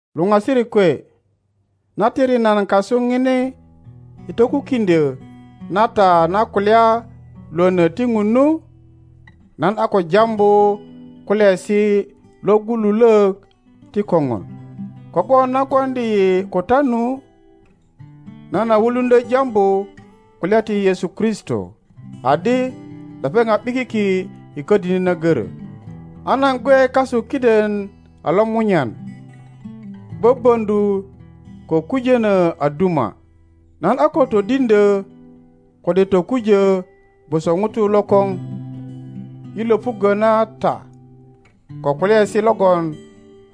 Luŋasirik kwe, na tiri nan kasuŋini i tokukiŋdyo na ta na kulya Iwono ti Ŋun nu, nan a ko jambu kulyaesi logululok ti koŋon. Kogwon na gwoŋdi yi ko ta nu, nan a wuluŋdyo jambu kulya ti Yesu Kristo adi lepeŋ a ’bikiki i kodini na goro. A nan gwe kasu kiden a lomunyan, böböŋöju ko kujono a duma. Nan a ko todiŋdyo kode tokujo gwoso ŋuto lokoŋ i lopuggo na ta ko kulyaesi logon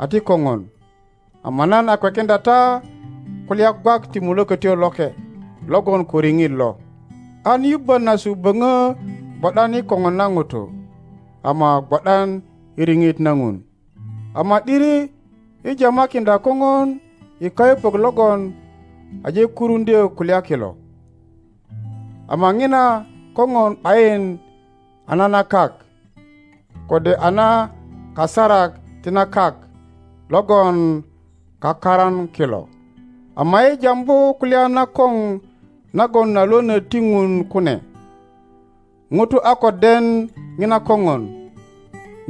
a ti kopon, ama nan a kwekiŋdya ta kulya gwak ti Mulokotyo Loke logon ko riŋit lo, anyubbonasu böŋo gwo ’dan i koŋon na Ŋutu ama gwo ’dan i riŋit na Ŋun. Ama ’diri yi jamakiŋdya kopon i kayupök logon aje kuruŋdyo kulya kilo. Ama ŋina koŋon ’bayin a na na kak, kode a na kasarak ti na kak logon kakaran kilo. Ama yi jambu kulya nakoŋ nagon a lwöno ti Ŋun kune; Ŋuto a ko den ŋina kogon.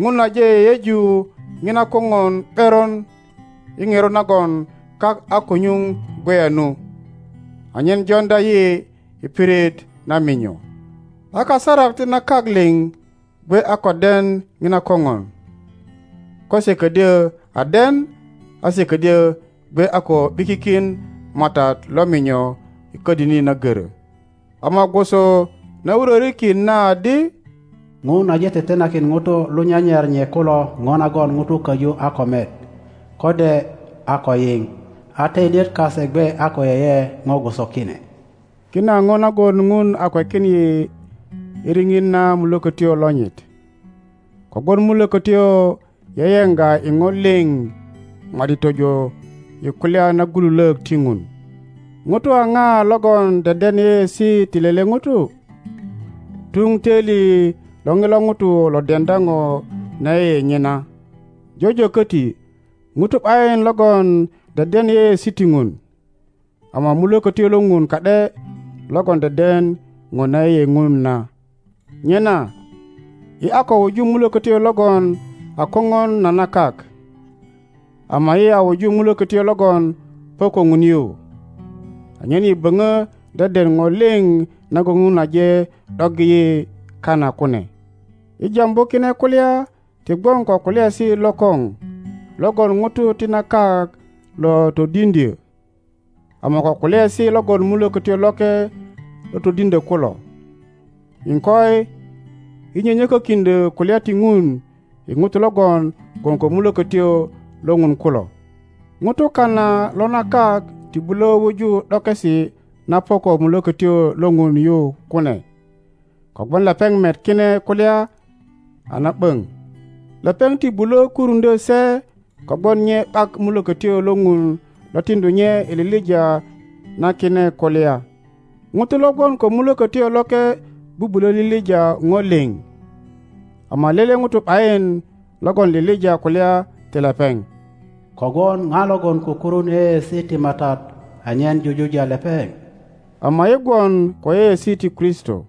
Ŋun aje yeyeju Ŋina koŋon ’beron i ŋerot nagon kak a ko nyuŋ gweya nu, anyen joŋdya yi i pirit na minyo. A kasarak ti na kak liŋ gwe a ko den Ŋina kopon. Ko se ködyö a den a se ködyö gwe a ko ’bikikin Matat lo minyo i kodini na goro. Ama gwoso na wurorikin na adi, Ŋun aje tetenakin Ŋutu lo nyanyar nye kuloro nagon ŋuto koju a ko met, kode a ko yiŋ, a toilyet kase gwe a ko yeye ŋo gwoso kine. Kine a ŋo nagon Ŋun a kwekin yi i riŋit na Mulokotyo lonyit, kogwon Mulokotyo yeye ŋga i ŋo liŋ ma ’di tojo i kulya nagululok ti Ŋun. Ŋuto a ŋa logon deden yeyeesi ti lele Ŋuto? Tuŋ toili lo Ŋilo Ŋuto lo deŋdya ŋo na yeye nye na. Jojo koti Ŋuto ’bayin logon deden yeyeesi ti Ŋun, ama Mulokotyo lo Ŋun ka ’de logon deden ŋo na yeye Ŋun na. Nyena yi a ko wuju mulokotyo logon a koŋon na na kak; ama yi a wuju Mulokotyo logon po ko Ŋun yu, anyen yi boŋo deden ŋo li nagon Ŋun aje ’doggi yi kana kune. Yi jambu kine kulya ti gwon ko kulyaesi lokoŋ logon Ŋutu ti na kak lo todiŋdyö ama ko kulyaesi logon Mulokotyo Loke lo todiŋdyo kulo. Iŋkoi, yi nyönyö kö kiŋdyö kulya ti Ŋun i Ŋutu logon gwon ko Mulokotyo lo Ŋun kulo. Ŋuto kana lo na kak ti bulo wuju ’dokesi na po ko Mulokotyo lo Ŋun yu kune, kogwon lepeŋ met kine kulya a na ’boŋ. Lepeŋ ti bulo kuruŋdyo se kogwon nye ’bak Mulokotyo lo Ŋun lo tiŋdu nye i lilija na kine kulya. Ŋuto lo gwon ko Mulokotyo Loke bubulo lilija ŋo liŋ, ama lele Ŋuto ’bayin logon lilija kulya ti lepeŋ. Kogwon Ŋa logon kukurun yeyeesi ti Matat anyen jujuja lepeŋ? Ama yi gwon ko yeyeesi ti Kristo.